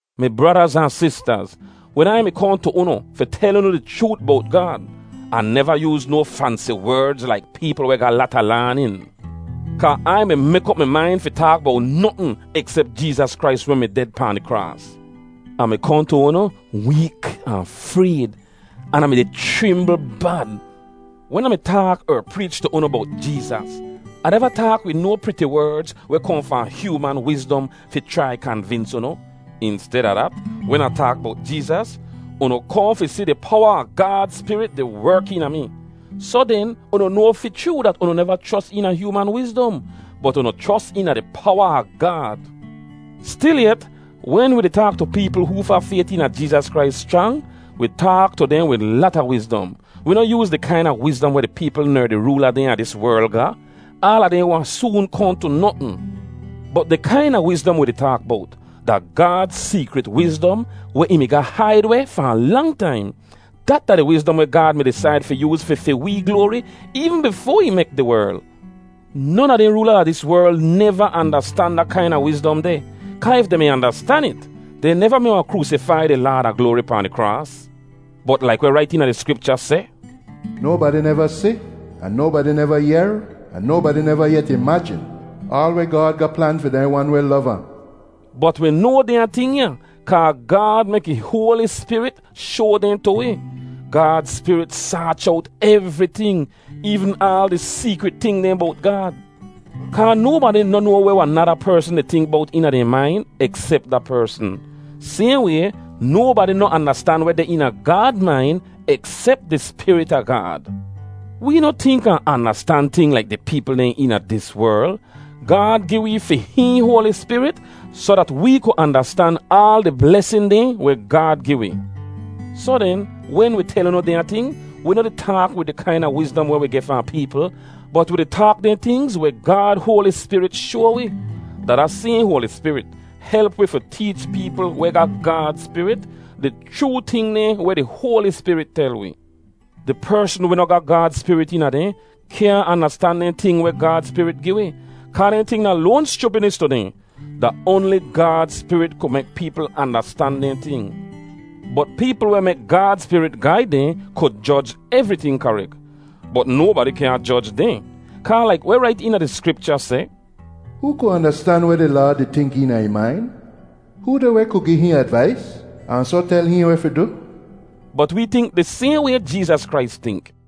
Mi bradaz ahn sistaz, wen Ai mi kohn tu unu fi tel unu di chroot bowt Gaad, Ah neva yooz no fansi werdz laik peepl weh ga lata laanin. Kaa Ai mi mek op mi main fi taak bowt notn eksep Jeezas Krais weh mi ded pahn di kraas. Ah mi kohn tu unu week ahn frayd, an Ah mi-di chrimbl bad. Wen Ah mi taak er preech tu unu bowt Jeezas, Ah neva taak wid no priti werdz weh kohn fahn hyooman wizdom fi chrai kanvins unu. Insteda dat, wen Ah taak bowt Jeezas, unu kohn fi si di powa a Gaad Spirit di werk eena mi. Soh den unu noa fi chroo dat unu neva chros eena hyooman wizdom, bot unu chros eena di powa a Gaad. Stilyet, wen wi di taak tu peepl hoofa fayt eena Jeezas Krais schrang, wi taak tu dehn wid lata wizdom. Wi noh yooz di kaina wizdom weh di peepl ner di roola dehn a dis werl ga. Aala dehn wahn soon kohn tu notn. Bot di kaina wizdom wi di taak bowt, da Gaad seekrit wizdom weh ih mi ga haid weh fahn lang taim. Dat da di wizdom weh Gaad mi disaid fi yooz fi fi wee gloari eevn bifoa ih mek di werl. Non a dehn roola a dis werl neva andastan da kaina wizdom deh, kaa if dehn mi andastan it, dehn neva mi wahn kroosifai di Laad a gloari pahn di kraas. Bot laik weh rait eena di Skripcha seh, “Nobadi neva si, ahn nobadi neva yehr, ahn nobadi neva yet imajin, aal weh Gaad ga plan fi dehn wan weh lov ahn.” Bot wi noa dehnya ting kaa Gaad mek ih Hoali Spirit shoa dehn tu wi. Gaad Spirit saach owt evriting, eevn aal di seekrit ting dehn bowt Gaad. Kaa nobadi noh noa weh wahn nada persn di tink bowt eena dehn main eksep da persn. Sayhn way, nobadi noh andastan weh deh eena Gaad main eksep di Spirit a Gaad. Wee noh tink ahn andastan ting laik di peepl dehn eena dis werl. Gaad gi wee fi hihn Hoali Spirit soh dat wee ku andastan aal di blesin dehn weh Gaad gi wi. Soh den, wen wi tel unu dehnya ting, wi noh di taak wid di kaina wizdom weh wi geh fahn peepl, bot wi di taak dehn tingz weh Gaad Hoali Spirit shoa wi. Da da sayhn Hoali Spirit help wi fi teech peepl weh ga Gaad Spirit di chroo ting dehn weh di Hoali Spirit tel wi. Di persn weh noh ga Gaad Spirit eena dehn, kyaahn andastan dehn ting weh Gaad Spirit gi wi, kaa dehn ting da loan schupidnis tu dehn. Da oanli Gaad Spirit ku mek peepl andastan dehn ting. Bot peepl weh mek Gaad Spirit gaid dehn ku joj evriting karek. Bot nobadi kyaahn joj dehn. Kaa laik weh rait eena di Skripcha seh, “Hoo ku andastan weh di Laad di tink eena ih main? Hoo deh weh ku gi hihn advais, ahn soh tel hihn weh fi du?” Bot wee tink di sayhn way Jeezas Krais tink.